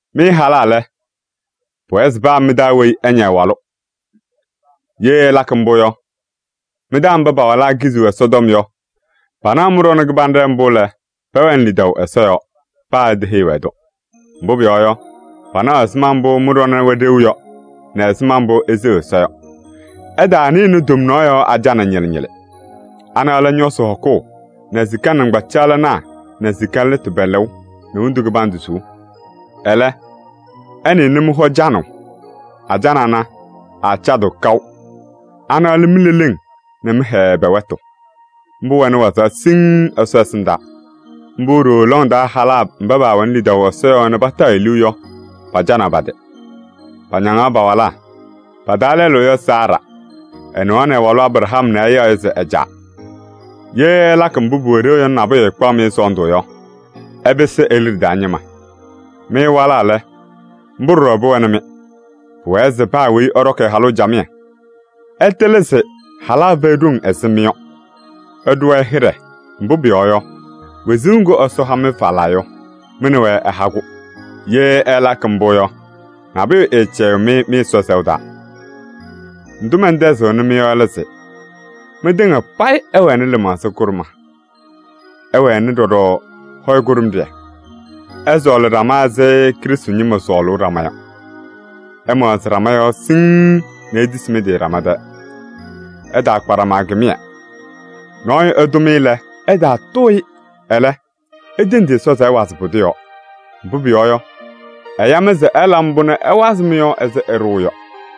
Mɩ halaa lɛ, pʋwɛɛ se paa mɩ-taa weyi ɛña ɛ-walʋ. Ye ɩlakɩ mbʋ yɔ, mɩ-taa mba pa-walaa kiziɣ Ɛsɔtɔm yɔ, panaɣ mɩ-ɖɔnɛ kɩbanɖɛ mbʋ lɛ, pɛwɛnɩ lidaʋ Ɛsɔ yɔɔ, paa iteheyi-wɛ-tʋ. Mbʋ pʋyɔɔ yɔ, panaɣ ɛzɩma mbʋ mɩ-ɖɔnɛ wɛ ɖeu yɔ nɛ ɛzɩma mbʋ iseɣ Ɛsɔ yɔ. Ɩtaanɩnɩ tomnaɣ yɔɔ ajana ñɩlɩ ñɩlɩ. Ana lɛ ñɔsɩ hɔkʋʋ nɛ sika nɩŋgbacaɣlɩnaa nɛ sika lɩtʋ pɛ-lɛʋ nɛ wondu kɩbandʋ suu. Ɛlɛ, ɩnɩnɩ mɩ-hɔ canʋʋ. Ajana ana, aacadɩɣ kaʋ. Ana lɛ mi-leleŋ nɛ mɩ-hɛɛ pɛ-wɛtʋ. Mbʋ wɛnɩ wazaɣ siŋŋ Ɛsɔ ɛsɩndaa. Mbʋ ɖooo lɔŋ taa halaa mba paawɛnɩ lidaʋ Ɛsɔ yɔɔ nɛ pataɣ-ɩ liu yɔ, pacanaɣ pa-tɩ: pañaŋaɣ pa-walaa. Pa-taa lɛlʋ yɔ Saara. Ɛnɩɣaɣnɩ ɛ-walʋ Abraham nɛ ɛyaɣ-ɩ se ɛ-caa. Ye ɩlakɩ mbʋ pʋwɛ ɖeu yɔ nɛ nabʋyʋ ɛɛkpaɣ-mɩ sɔɔndʋ yɔ, ɩpɩsɩ e-liɖe taa ñɩma. Mɩ walaa lɛ, mbʋ ɖɔɖɔ pʋwɛnɩ-mɩ: pʋwɛɛ se paa weyi ɛɖɔkɩ ɛ-halʋ camɩyɛ. Ɩtɩlɩ se halaa fɛyɩ ɖoŋ ɛzɩ mɩ yɔ. Ɩɖʋ-wɛ hɩɖɛ, mbʋ pʋyɔɔ yɔ, wezuu ŋgʋ Ɛsɔ ha-mɩ falaa yɔ, mɩ nɛ wɛ ɛha-kʋ. Ye ɩlakɩ mbʋ yɔ, nabʋyʋ ɛɛcɛyɩɣ-mɩ mɩ-Ɛsɔ sɛʋ taa. Ndʋ mɛntɛzɩɣnɩ yɔ lɛ se: mɩtɩŋa payɩ ɩwɛnɩ lɩmaɣza kʋɖʋma, ɩwɛnɩ ɖɔɖɔ hɔyɛ kʋɖʋmɖɩyɛ. Ɩsɔɔlɩ ɖama ɛzɩ Krɩstʋ ñɩma sɔɔlʋʋ ɖama yɔ. Ɩmaɣzɩ ɖama yɔɔ siŋŋ nɛ itisi mɩ-tɩ ɖama tɛɛ. Ɩtaakpa ɖama kɩmɩyɛ. Nɔɔyʋ ɛtʋ-mɩ lɛ, ɩtaatʋʋ-ɩ. Ɛlɛ, itendi Ɛsɔ se ɛwazɩ pʋdʋ yɔɔ. Mbʋ pʋyɔɔ yɔ, ɛya-mɩ se ɩla mbʋ nɛ ɛwazɩ mɩ-yɔɔ ɛzɩ ɛɖʋʋ yɔ.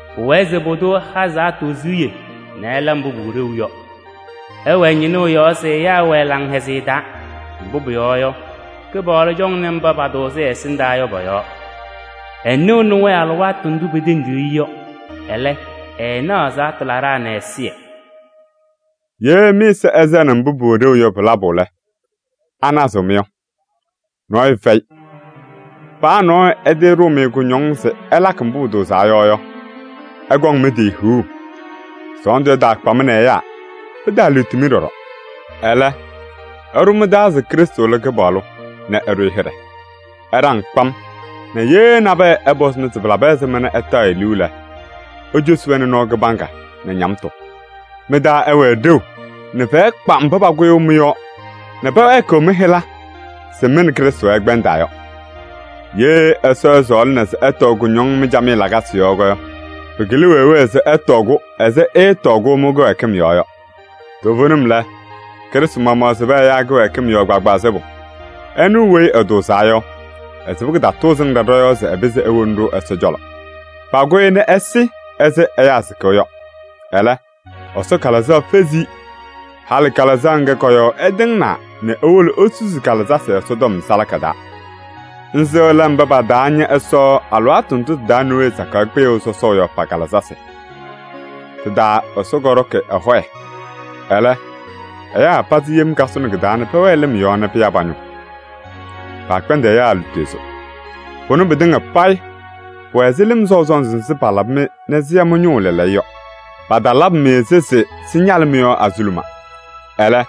Pʋwɛɛ se pʋdʋ ɛha ɛzaɣtʋ siɣye nɛ ɛla mbʋ pʋwɛ ɖeu yɔ. Ɛwɛɛ ñɩnʋʋ yɔɔ se ɛyaa ɛwɛɛ laŋhɛzɩyɛ taa. Mbʋ pʋyɔɔ yɔ, Kɩpaɣlʋ cɔŋnɩ mba patʋʋzɩ ɛ-ɛsɩndaa yɔ pɔ-yɔɔ. Ɛnɩɣnɩ-wɛ alɩwaatʋ ndʋ petendiɣ-i yɔ. Ɛlɛ, ɛɛnaɣ ɛzaɣtʋ laɖaa nɛ ɛzɩyɛ.” Ye mɩ-ɛza ɛsɛnɩ mbʋ pʋwɛ ɖeu yɔ pɩ-labʋ lɛ, anazɩɣ-mɩ yɔ? Nɔɔyʋ fɛyɩ. Paa nɔɔyʋ ɛtɩɩɖʋʋ-mɩ kʋñɔŋ se ɩlakɩ mbʋ pʋtʋʋzaa yɔ yɔ, ɩkɔŋ hiɣu mɩ-tɩ! Sɔɔndʋ ɛtaakpa-mɩ nɛ ɛyaa. Pɩtaaliɣti-mɩ ɖɔɖɔ. Ɛlɛ, ɩɖʋ mɩ-taa se Krɩstʋ lɛ Kɩpaɣlʋ nɛ ɩɖʋ-ɩ hɩɖɛ. Ɩɖaŋ kpam nɛ ye nabɛyɛ ɛpɔzɩ-mɩ se pɩlabɩ ɛzɩma nɛ ɩtaɣ-ɩ liu lɛ, icosi-wɛ nɔɔ kɩbaŋga nɛ ñamtʋ. Mɩ-taa ɛwɛɛ ɖeu nɛ fɛyɛ kpa mba pakʋyʋʋ mɩ-yɔɔ nɛ pɛwɛɛkɩɣ mɩ-hɩla se mɩ nɛ Krɩstʋ ɩkpɛndaa yɔ. Ye Ɛsɔ ɛsɔɔlɩna se ɩtɔɔ kʋñɔŋ mɩ-camɩyɛ lakasɩ yɔɔ yɔ, pɩkɩlɩ wee wee se ɩtɔɔ-kʋ ɛzɩ ɩɩtɔɔ-kʋ mɩ-kɩwɛɛkɩm yɔɔ yɔ. Toovenim lɛ, Krɩstʋ maɣmaɣ sɩbɩ ɛyaa kɩwɛɛkɩm yɔɔ kpaagbaa sɩbʋ. Ɛnʋ weyi ɛtʋʋzaa yɔ, ɛsɩbɩ kɩtatʋʋzɩŋ ɖa ɖɔ-yɔɔ se ɛpɩzɩ ewoni-ɖʋ Ɛsɔ cɔlɔ. Pakʋ-ɩ nɛ ɛsɩ ɛzɩ ɛyaa sɩkʋʋ yɔ. Ɛlɛ, Ɛsɔ Kalɩzaɣ fezi-i. Halɩ Kalɩzaɣ ŋga kɔ-yɔɔ ɛtɩŋnaa nɛ ewolo esusi ɖɔɖɔ kalɩzasɩ Ɛsɔtɔm salaka taa. Nzɩ lɛ mba pataaña Ɛsɔ alɩwaatʋ ndʋ tɩ-taa Nowee sakaɣ kpɩyʋʋ sɔsɔʋ yɔ pa-kalɩzasɩ. Tɩ-taa Ɛsɔ kɔɖɔkɩ ɛ-hɔyɛ. Ɛlɛ, ɛyaa pazɩ yem kasʋnɩ kɩ-taa nɛ pɛwɛɛ lɩm yɔɔ nɛ pɩya pa-ñʋʋ. Paakpɛndɩ ɛyaa lutozo. Pʋnɛ pɩtɩŋa payɩ pʋwɛ ɛzɩ lɩm sɔʋ sɔnzɩ nzɩ palabɩ-mɩ nɛ sɩya mɩ-ñʋʋ lɛɛlɛɛyɔ yɔ. Patalabɩ-mɩ-sɩ se sɩñalɩ mɩ-yɔɔ azuluma. Ɛlɛ,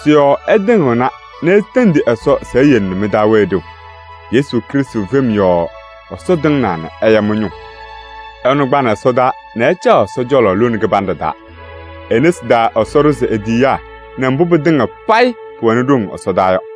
sɩ-yɔɔ ɩtɩŋɩɣna nɛ itendi Ɛsɔ se eyele nɛ mɩ-taa wɛɛ ɖeu. Yesu Krɩstʋ fem yɔɔ Ɛsɔ tɩŋɩɣna nɛ ɛya mɩ-ñʋʋ. Ɛnʋ kpanɩ ɛsɔdaa nɛ ɛcaɣ Ɛsɔ cɔlɔ lone kɩbanɖɛ taa. E-nesi taa Ɛsɔ ɖʋzɩ e-tiyiyaa nɛ mbʋ pɩtɩŋa payɩ pʋwɛnɩ ɖoŋ ɛsɔdaa yɔ.